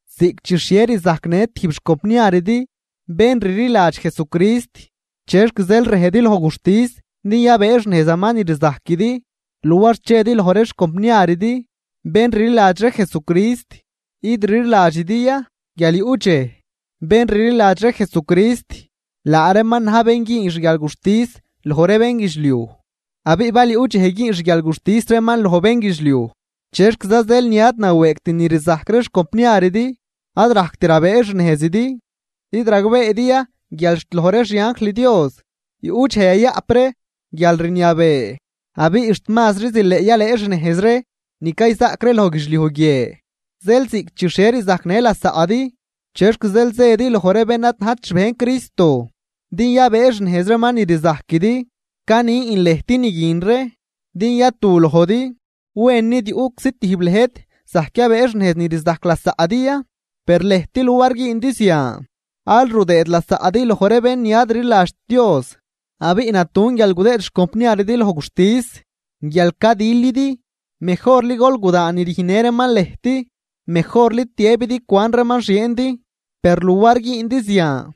Ziꞌc chi xhie rzajcnë tijb xcompniaridi bén rliladx Jesucrist, ¿chexc zeel rëjdi loj guxtis din yabëëxnejzaman ni rzajquidi luar chedi loj ree xcompniaridi bén rliladx ree Jesucrist? ¿Id rliladxidi ya guial yuꞌ dxej bén rliladx ree Jesucrist laa reeman na̱j bén güün xguialguxtis loj ree bénguidxliuj? Abiꞌ bal yuꞌ dxej güün xguialguxtis reeman loj bénguidxliuj, ¿chexquiza zeel ni ad nawëëgt ni rzajc ree xcompniaridi ad rajct rabëëxnejzidi? ¿Id ragbeedi ya guial xt loj ree xianjl Dios yuꞌ dxej yayaꞌp ree guialrniabee? ¡Abiꞌ xt mazri zileꞌ yalëëxnejz ree ni cayzaꞌc ree loj guidxliuj guie! Zeel ziꞌc chi xhie rzajcnë lasaꞌdi, ¿chexc zeel zëdi loj ree bén ad najt xbejn Cristo din yabëëxnejz reeman ni rzajquidi? Canin lëjt ni guin ree din yatu lojdi. ¿Wen nid yuꞌczi tijb lëjt zajc yabëëxnejz ni rzajc lasaꞌdi ya? Per lëjt luar güündi zian aal rudëëd lasaꞌdi loj ree bén ni ad rliladxt Dios. Abiꞌ natun guial gudëëd xcompniaridi loj guxtis guial cadilidi, mejorli gol gudaan ni rüjnnë reeman lëjt. Mejorli tiëbidi cuan reeman xieendi. Per luar güündi zian,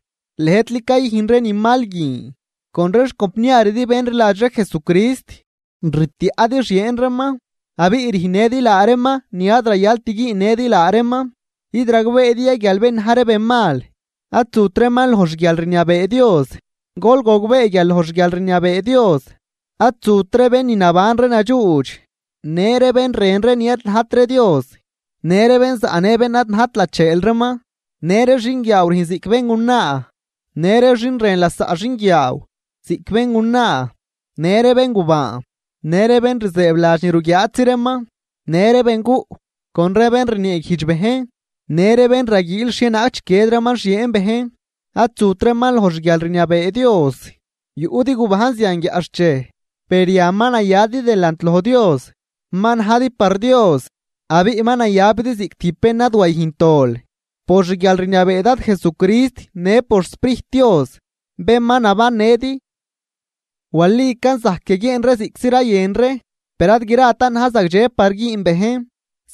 lëjtli cayüjn ree ni mal guin con ree xcompniaridi bén rliladx ree Jesucrist. Rtiaꞌdi xieen reeman abiꞌ rüjnnëdi laa reeman ni ad rayalt güünnëdi laa reeman. ¿Id ragbeedi ya guial bén na̱j ree benmal ad zut reeman loj xguialrniabee Dios? Gol gogbee guial loj xguialrniabee Dios ad zut ree bén ni naban ree nadxuudx, në ree bén rën ree ni ad najt ree Dios, në ree bén zaꞌnë bén ad najt lacheel reeman, në ree xinguiaaw rüjn ziꞌc béngunaa në ree xin rën lasaꞌ xinguiaaw ziꞌc béngunaa. Në ree béngubaan, në ree bén rzëëbladx ni ruguiaatzi reeman, në ree benguꞌ con ree bén rnieeguijdx bejn, në ree bén raguiil xhienaag chiquied reeman xieen bejn, ad zut reeman loj xguialrniabee Dios. Yuꞌdi gubajn zian guiaꞌxchej, per yan ma nayadi delant loj Dios, ma najdi par Dios, abiꞌ ma nayabidi ziꞌc tijb bén ni ad wayüjnt dol por xguialrniabee Dad Jesucrist në por xSprijt Dios bén ma nabannëdi. Walican zajc yaguieen ree ziꞌctzi rayën ree, per ad gratan na̱j zagdxe par güün bejn.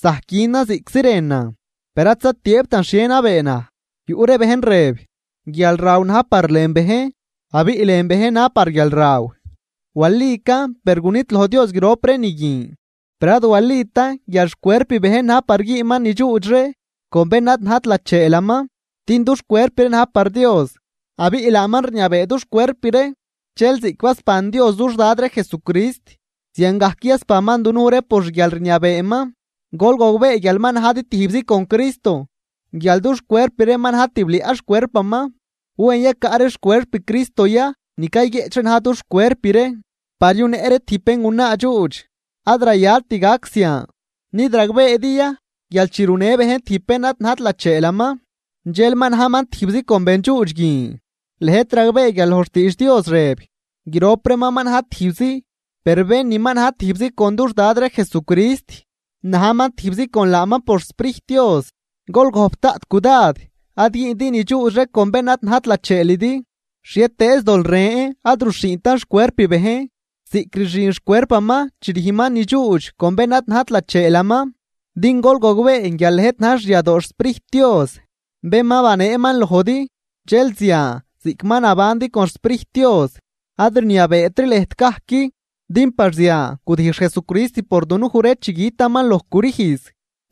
Zajc günan ziꞌctzi rënan, per ad zatiëëbtan xhie nabee naj. Yuꞌ ree bejn rëb: “Guialraw na̱j par lën bejn, abiꞌ lën bejn na̱j par guialraw.” Walican, per gunidloj Dios grop ree ni guin. Per ad walitan guial xcuerp bejn na̱j par güünman ni dxuudx ree con bén ad najt lacheelaman. Din dux cuerp ree na̱j par Dios, abiꞌ laaman rniabee dux cuerp ree. Dxel ziꞌc basban Dios dux Dad ree Jesucrist, ziangajc yasbanman dunuj ree por xguialrniabeeman. Gol gogbee guial ma najdi tijbzi con Cristo, guial dux cuerp ree ma na̱j tibliaꞌ xcuerpaman. ¿Wen yacaꞌ ree xcuerp Cristo ya ni cayguieꞌch ree na̱j dux cuerp ree par yunëꞌ ree tijb béngunaa dxuudx? ¡Ad rayalt gac zian! ¿Nid ragbeedi ya guial chi runë bejn tijb bén ni ad najt lacheelaman, dxel ma najman tijbzi con bendxuudx guin? Lëjt ragbee guial loj xtiidx Dios rëb: “Grop reeman ma na̱j tijbzi.” Per bén ni ma na̱j tijbzi con dux Dad ree Jesucrist, najman tijbzi con laaman por xSprijt Dios. Gol gojp daꞌt cudad ad güündi ni dxuudx ree con bén ad najt lacheelidi. Xhietëëz dol ren ad ruxhiintan xcuerp bejn ziꞌc rxin xcuerpaman chi rüjnman ni dxuudx con bén ad najt lacheelaman. Din gol gogbee guial lëjt na̱j xyadoo xSprijt Dios bén ma baneeman lojdi, dxel zian ziꞌc ma nabandi con xSprijt Dios ad rniabeetri lëjt gajc. Din par zian gudijx Jesucrist por dunuj ree chi gütaman loj crüjz.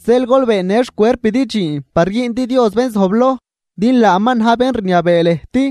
Zeel gol beennë xcuerpidi dxiin par güündi Dios bén zojbloj, din laaman na̱j bén rniabee lëjt.